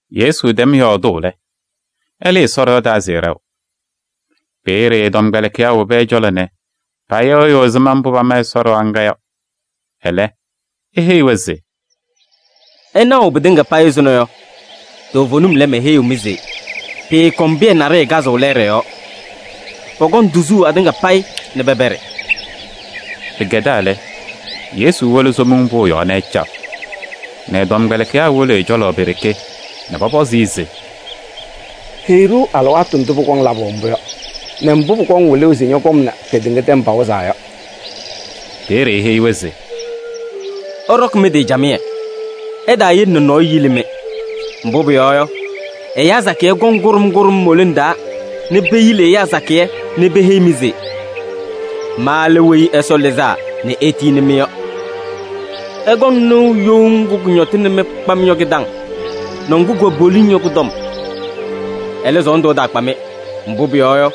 Yesu tɛm yɔɔdʋʋ lɛ, ɛlɩɩ Ɛsɔ ɖɩɣa taa se ɛɖɛɣ. Peeye ɛ-tɔmkpɛlɩkɩyaa wobi ɛ-cɔlɔ nɛ payɩɣyɩɣ ɛzɩma mbʋ pama Ɛsɔ ɖɩɣa ŋga yɔ. Ɛlɛ, eheyi-wɛ se: “Ɩnaɣʋ pɩtɩŋa payɩ ɛzʋnɔ yɔ, toovenim lɛ, meheyiɣ-mɩ se pɩɩkɔŋ pɩyɛ naɖɩyɛ kazʋʋ lɛɛɖɛ yɔɔ, pɔkɔŋ tuzuu atɩŋa payɩ nɛ pɛpɛɖɩ.” Pɩkɛdaa lɛ, Yesu wolo Somiŋ Pʋʋ yɔɔ nɛ ɛcaɣ nɛ ɛ-tɔmkpɛlɩkɩyaa wolo ɛ-cɔlɔ pe-ɖeke nɛ pɔpɔzɩ-ɩ se: “Heyi-ɖʋ alɩwaatʋ ndʋ pɩkaɣ labʋ mbʋ yɔ nɛ mbʋ pʋkɔŋ wɩlʋʋ se ñɔ-kɔm nɛ kedeŋa tɛm pawɩzaa yɔ.” Peeye eheyi-wɛ se: “Ɩɖɔkɩ mɩ-tɩ camɩyɛ, ɩtaayele nɛ nɔɔyʋ yili-mɩ. Mbʋ pʋyɔɔ yɔ, ɛyaa sakɩyɛ kɔŋ kʋɖʋm kʋɖʋm mo-lone taa nɛ peyili ɛyaa sakɩyɛ nɛ peheyi-mɩ se: ‘Ma lɛ Weyi Ɛsɔ Lɩzaa nɛ etiyini-mɩ’ yɔ. Ɩkɔŋ nɩʋ you ŋgʋ kʋñɔtɩnɩ-mɩ kpam yɔ kɩ-taŋ nɛ ŋgʋ kʋwɛ poliŋ yɔ kʋ-tɔm. Ɛlɛ, sɔɔndʋ ɛtaakpa-mɩ, mbʋ pʋyɔɔ yɔ,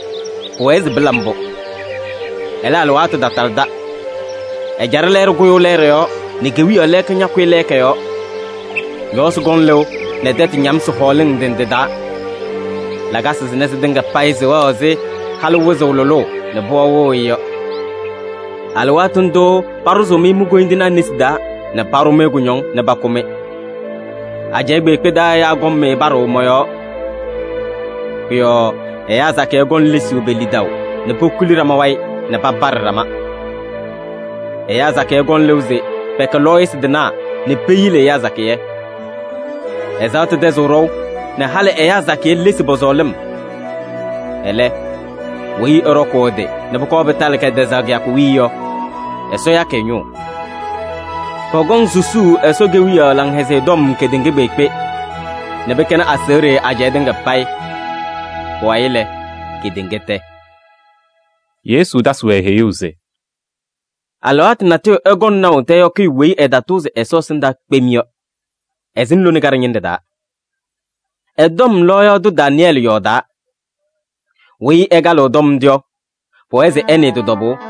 pʋwɛɛ se pɩla mbʋ. Ɛlɛ, alɩwaatʋ tatalɩda. Ɛjaɖɛ lɛɛɖɛ kʋyʋʋ lɛɛɖɛ yɔɔ nɛ kewiyaɣ lɛɛka ñakʋyɩ lɛɛka yɔɔ. Ñɔɔsɩ kɔŋ lɩʋ nɛ tɛtʋ ñamsɩ hɔɔlɩŋ ndɩ ndɩ taa. Lakasɩ sɩnɛ sɩtɩŋa payɩ sɩwɛɣ ɛzɩ halʋ wɩzʋʋ lʋlʋʋ nɛ pɩɣa wɩɣ-ɩ yɔ. “Alɩwaatʋ ndʋʋ paɖʋzʋʋ-mɩ mi-koyindinaa nesi taa nɛ paɖʋ-mɩ kʋñɔŋ nɛ pakʋ-mɩ. Ajɛɛ kpeekpe taa ɛyaa kɔŋ-mɩ paɖʋʋ mɔ-yɔɔ. Pʋ-yɔɔ ɛyaa sakɩyɛ kɔŋ lesuu pe-lidaʋ nɛ pokuli ɖama wayɩ nɛ papaɖɩ ɖama. Ɛyaa sakɩyɛ kɔŋ lɩʋ se pɛkɛ lɔɔyɩsɩ tɩnaa nɛ peyili ɛyaa sakɩyɛ. Ɛzaɣtʋ tɛzɩɣ ɖɔʋ nɛ halɩ ɛyaa sakɩyɛ lesi pɔ-sɔɔlɩm. Ɛlɛ, weyi ɛɖɔkʋʋ ɛ-tɩ nɛ pʋkɔɔ pɩtalɩ kɛtɛzaɣ kɩyakʋ wiye yɔ, Ɛsɔ yakɩ ɛ-ñʋʋ. Pɔkɔŋ susuu Ɛsɔ Kewiyaɣ Laŋhɛzɩyɛ Tɔm kedeŋa kpeekpe nɛ pɩkɛnɩ aseɣɖe ajɛɛ tɩŋa payɩ. Pʋwayɩ lɛ, kedeŋa tɛ.” Yesu tasɩ-wɛ heyuu se: “Alɩwaatʋ natʋyʋ ɩkɔŋ naʋ tɛyɔkɩyʋ weyi ɛtatʋʋzɩ Ɛsɔ ɛsɩndaa kpem yɔ, ɛsɩŋ lone kaɖɛ ñɩnɖɛ taa. Ɛ-tɔm lɔɔyaɣ tʋ Daanɩyɛɛlɩ yɔɔdaa. Weyi ɛkalɩɣ tɔm ndʋ yɔ, pʋwɛɛ se ɛnɩɩ tɩ-tɔbʋʋ.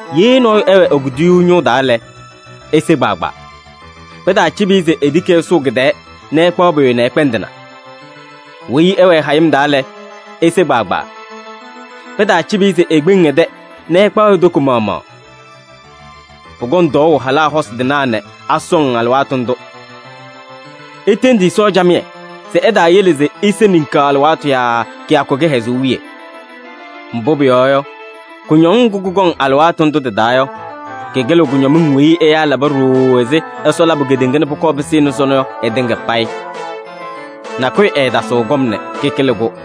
Ye nɔɔyʋ ɛwɛ e-kuduyuu ñʋʋ taa lɛ, ese kpaagbaa. Pɩtaacɩbɩ-ɩ se etiki ɛsʋʋ kɩ-tɛɛ nɛ ɛkpaɣ pʋyʋ nɛ ɛkpɛndɩna. Weyi ɛwɛ hayɩm taa lɛ, ese kpaagbaa. Pɩtaacɩbɩ-ɩ se ekpeŋ ɛ-tɛ nɛ ɛkpaɣ e-toko maɣmaɣ. Pʋkɔŋ tɔɔʋ halaa hosi tɩnaa nɛ asɔŋ alɩwaatʋ ndʋ! Itendi Ɛsɔ camɩyɛ se ɛtaayele se ise ninkaɣ alɩwaatʋ yaa kɩyakʋ kɩhɛzʋʋ wiye. Mbʋ pʋyɔɔ yɔ, kʋñɔŋ ŋgʋ kʋkɔŋ alɩwaatʋ ndʋ tɩ-taa yɔ, kɩkɩlɩɣ kʋñɔmɩŋ weyi ɛyaa laba ɖooo ɛzɩ Ɛsɔ labʋ kedeŋa nɛ pʋkɔɔ pɩsɩnɩ sɔnɔ yɔ ɩtɩŋa payɩ. Nakʋyʋ ɛɛtasɩɣ kɔm nɛ kɩkɩlɩ-kʋ.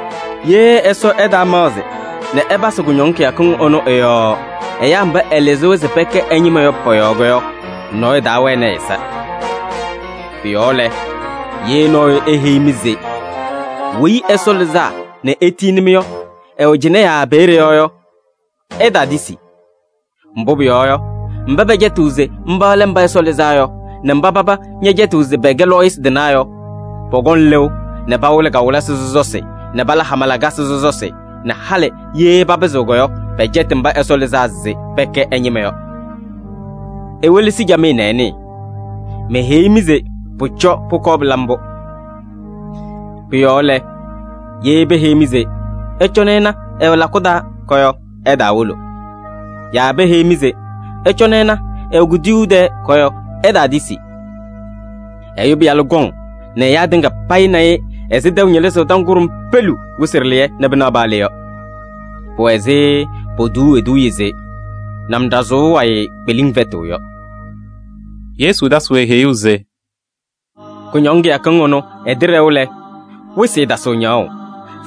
Ye Ɛsɔ ɛtaamaɣzɩ nɛ ɛpasɩ kʋñɔŋ kɩyakɩŋ ɩnʋ ɩ-yɔɔ ɛyaa mba ɛlɩzɩ-wɛ se pɛkɛ ɛ-ñɩma yɔ pɔ-yɔɔ yɔ, nɔɔyʋ taawɛnɩ ɛ-ɛza. “Pʋ-yɔɔ lɛ, ye nɔɔyʋ eheyi-mɩ se Weyi Ɛsɔ Lɩzaa nɛ etiyini-mɩ yɔ, ɛwɛ cɩnɛ yaa peeye yɔ yɔ, ɩtaatisi. Mbʋ pʋyɔɔ yɔ, mba pɛcɛtɩɣ se mba lɛ Mba Ɛsɔ Lɩzaa Yɔ nɛ mba paba ñɛcɛtɩɣ se pɛkɛ lɔɔyɩsɩ tɩnaa yɔ, pɔkɔŋ lɩʋ nɛ pawɩlɩ kawɩlɩsɩ sɔsɔsɩ nɛ pala hama lakasɩ sɔsɔsɩ nɛ halɩ ye papɩzɩɣ yɔ, pɛcɛtɩ mba Ɛsɔ lɩzaa se pɛkɛ ɛ-ñɩma yɔ. Iwelesi camɩyɛ nɛ ɩnɩɩ, meheyi-mɩ se pʋcɔ pʋkɔɔ pɩla mbʋ. “Pʋ-yɔɔ lɛ, ye peheyi-mɩ se: ‘Ɩcɔnɩ ɩna, ɛwɛ lakʋ taa’ yɔ, ɩtaawolo. Yaa peheyi-mɩ se: ‘Ɩcɔnɩ ɩna, ɛwɛ kuduyuu tɛɛ’ yɔ, ɩtaatisi. Ɛyʋ Pɩyalʋ kɔŋ nɛ ɛyaa tɩŋa payɩ na-ɩ ɛzɩ tɛʋ ñɩlɩzʋʋ tɔm kʋɖʋm peleu wɩsɩ ɖɩlɩyɛ nɛ pɩnaɣ paa le yɔ. Pʋwɛ ɛzɩ potuuu eduuye se: ‘Namɖazʋʋ wayɩ kpeliŋ fɛtɩɣ’ yɔ.” Yesu tasɩ-wɛ heyuu se: “Kʋñɔŋ kɩyakɩŋ ɩnʋ ɩtɩɖɛɣ lɛ, wɩsɩ ɛɛtasɩɣ ñaɣʋ,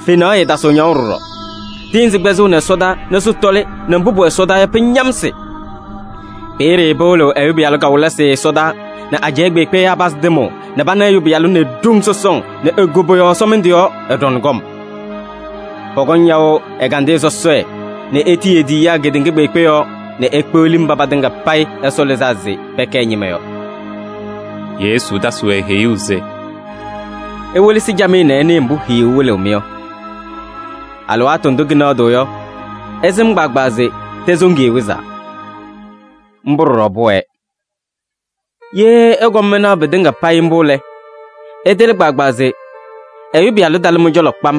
fenaɣ ɛɛtasɩɣ ñaɣʋ ɖɔɖɔ. Tɩɩnzɩ kpɛzɩɣnɩ ɛsɔdaa nɛ sɩtɔlɩ nɛ mbʋ pʋwɛ ɛsɔdaa yɔ, pɩñamsɩ. Peeye pɩwɩlɩɣ Ɛyʋ Pɩyalʋ kawɩlɩsɩ ɛsɔdaa nɛ ajɛɛ kpeekpe ɛyaa pazɩ tɩmʋʋ nɛ pana Ɛyʋ Pɩyalʋ nɛ e-ɖoŋ sɔsɔŋ nɛ e-koboyaɣ ɛsɔmɩndʋ yɔɔ, ɛɖɔŋ kɔm. Pɔkɔŋ yaʋ ɛgandɩyɛ sɔsɔɖɛ nɛ etiyi e-tiyiyaa kedeŋa kpeekpe yɔɔ nɛ pekpeɣli mba patɩŋa payɩ Ɛsɔ lɩzaa se pɛkɛ ɛ-ñɩma yɔ.” Yesu tasɩ-wɛ heyuu se: “Iwelesi camɩyɛ nɛ ɩnɩɩ mbʋ hiyuu wɩlɩɣ-mɩ yɔ: alɩwaatʋ ndʋ kɩnɛɣdɩɣ yɔ, ɩsɩm kpaagbaa se tɛsoŋiye wɩzaa. Mbʋ ɖɔɖɔ pʋwɛɛ. Ye ɩkɔm ɩnaɣ pɩtɩŋa payɩ mbʋ lɛ, ɩtɩlɩ kpaagbaa se Ɛyʋ Pɩyalʋ talɩ mɩ-cɔlɔ kpam.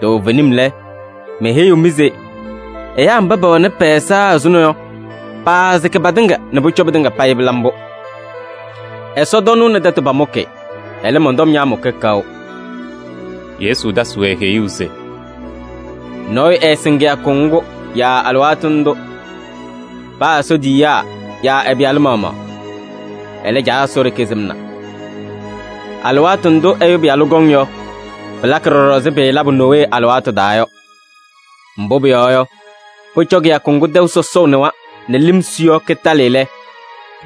Toovenim lɛ, meheyiɣ-mɩ se: ɛyaa mba pɛwɛnɩ pɛ-ɛza ɛzʋnɔ yɔ, paasɩkɩ patɩŋa nɛ pʋcɔ pɩtɩŋa payɩ pɩla mbʋ. Ɛsɔtɔnʋʋ nɛ tɛtʋ pamʋkɩ, ɛlɛ, mɔn-tɔm ñaamʋkɩ kaʋ.” Yesu tasɩ-wɛ heyuu se: “Nɔɔyʋ ɛɛsɩŋ kɩyakʋ ŋgʋ yaa alɩwaatʋ ndʋ. Paa Ɛsɔ tiyiyaa yaa ɛ-Pɩyalʋ maɣmaɣ. Ɛlɛ, Caa Ɛsɔ ɖeke sɩmna. Alɩwaatʋ ndʋ Ɛyʋ Pɩyalʋ kɔŋ yɔ, pɩlakɩ ɖɔɖɔ ɛzɩ pɩɩlabʋ Nowee alɩwaatʋ taa yɔ. Mbʋ pʋyɔɔ yɔ, pʋcɔ kɩyakʋ ŋgʋ tɛʋ sɔsɔʋ nɩwa nɛ lɩm su yɔ kɩtalɩ lɛ,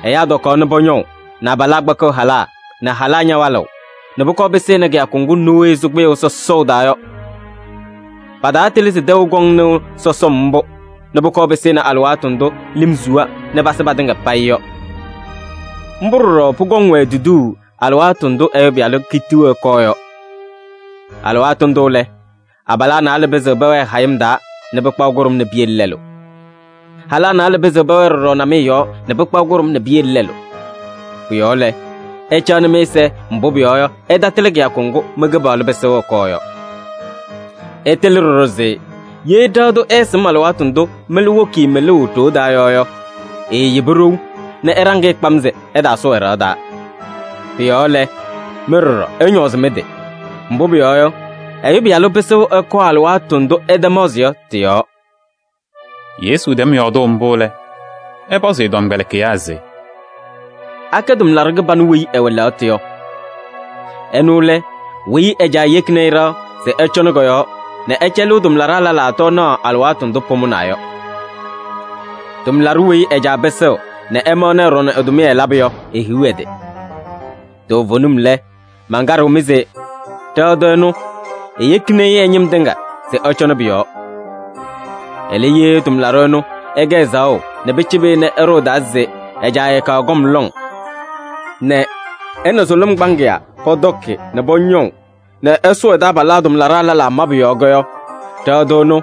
ɛyaa tɔkaɣ nɛ pɔñɔʋ nɛ abalaa kpakɩɣ halaa nɛ halaa ñawalɩɣ nɛ pʋkɔɔ pɩsɩnɩ kɩyakʋ ŋgʋ Nowee sʋ kpɩyʋʋ sɔsɔʋ taa yɔ. Pataatɩlɩ se tɛʋ kɔŋ nɩʋ sɔsɔm mbʋ nɛ pʋkɔɔ pɩsɩnɩ alɩwaatʋ ndʋ lɩm suwa nɛ pasɩ patɩŋa payɩ yɔ. Mbʋ ɖɔɖɔ pʋkɔŋ-wɛ tuduu alɩwaatʋ ndʋ Ɛyʋ Pɩyalʋ kitiɣ ɛkɔɔ yɔ. Alɩwaatʋ ndʋ lɛ, abalaa naalɛ pɩzɩɣ pɛwɛɛ hayɩm taa nɛ pɩkpaɣ kʋɖʋm nɛ piyele lɛlʋ. Halaa naalɛ pɩzɩɣ pɛwɛɛ ɖɔɖɔ namɩyɛ yɔɔ nɛ pɩkpaɣ kʋɖʋm nɛ piyele lɛlʋ. Pʋ-yɔɔ lɛ, ɩcaɣnɩ mɩ-ɛza, mbʋ pʋyɔɔ yɔ, ɩtatɩlɩ kɩyakʋ ŋgʋ mɩ-Kɩpaɣlʋ pɩsɩɣ ɛkɔɔ yɔ. Ɩtɩlɩ ɖɔɖɔ se ye ɖɩɣa tʋ ɛɛsɩm alɩwaatʋ ndʋ mɩlʋ woki-i mɩlʋʋ ɖoo taa yɔ yɔ, eeyebi ɖou nɛ ɛɖaŋ-ɩ kpam se ɛtaasʋʋ ɛ-ɖɩɣa taa. Pʋ-yɔɔ lɛ, mɩ ɖɔɖɔ ɩñɔɔzɩ mɩ-tɩ, mbʋ pʋyɔɔ yɔ, Ɛyʋ Pɩyalʋ pɩsɩɣ ɛkɔɔ alɩwaatʋ ndʋ ɩtamaɣzɩ yɔ tɩ-yɔɔ.” Yesu tɛm yɔɔdʋʋ mbʋ lɛ, ɛpɔzɩ ɛ-tɔmkpɛlɩkɩyaa se: “Akɛ tʋmlaɖʋ kɩbanʋ weyi ɛwɛ lɛɣtʋ yɔ? Ɛnʋ lɛ weyi ɛ-caa yekini-i ɖɩɣa se ɛcɔŋnɩ kɔ-yɔɔ nɛ ɛcɛlɩɣ tʋmlaɖaa lɛlaa tɔɔnaɣ alɩwaatʋ ndʋ pʋmʋnaa yɔ. Tʋmlaɖʋ weyi ɛ-caa pɩsɩɣ nɛ ɛmaɣnɩ ɛɖɔŋ ɛ-tʋmɩyɛ labʋ yɔ, ehiɣ ɛ-tɩ! Toovenim lɛ, mankaɖɩɣ-mɩ se: ɖɩɣa tʋ ɛnʋ, eyekini-i ɛ-ñɩm tɩŋa se ɛcɔnɩ pʋ-yɔɔ. Ɛlɛ, ye tʋmlaɖʋ ɛnʋ ɛkɛ ɛzaɣʋ nɛ pɩcɩbɩ-ɩ nɛ ɛɖʋ ɛ-taa se ɛ-caa ɛɛkaɣ kɔm lɔŋ nɛ ɛ nɛ sʋlʋm kpaŋɩyaa pɔtɔkɩ nɛ pɔñɔʋ nɛ ɛsʋʋ ɛ-taabalaa tʋmlaɖaa lɛlaa mabʋ yɔɔ yɔ, ɖɩɣa tʋ ɛnʋ,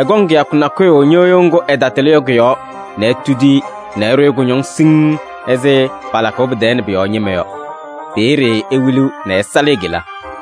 ɛkɔŋ kɩyakʋ nakʋyʋ ñɩɣyʋʋ ŋgʋ ɛtatɩlɩ yɔ kʋ-yɔɔ nɛ etudi-i nɛ ɛɖʋ-ɩ kʋñɔŋ siŋŋ ɛzɩ palakʋʋ tɛɛ nɛ pʋ-yɔɔ ñɩma yɔ. Peeye ewiliɣ nɛ ɛsalɩ e-kela.”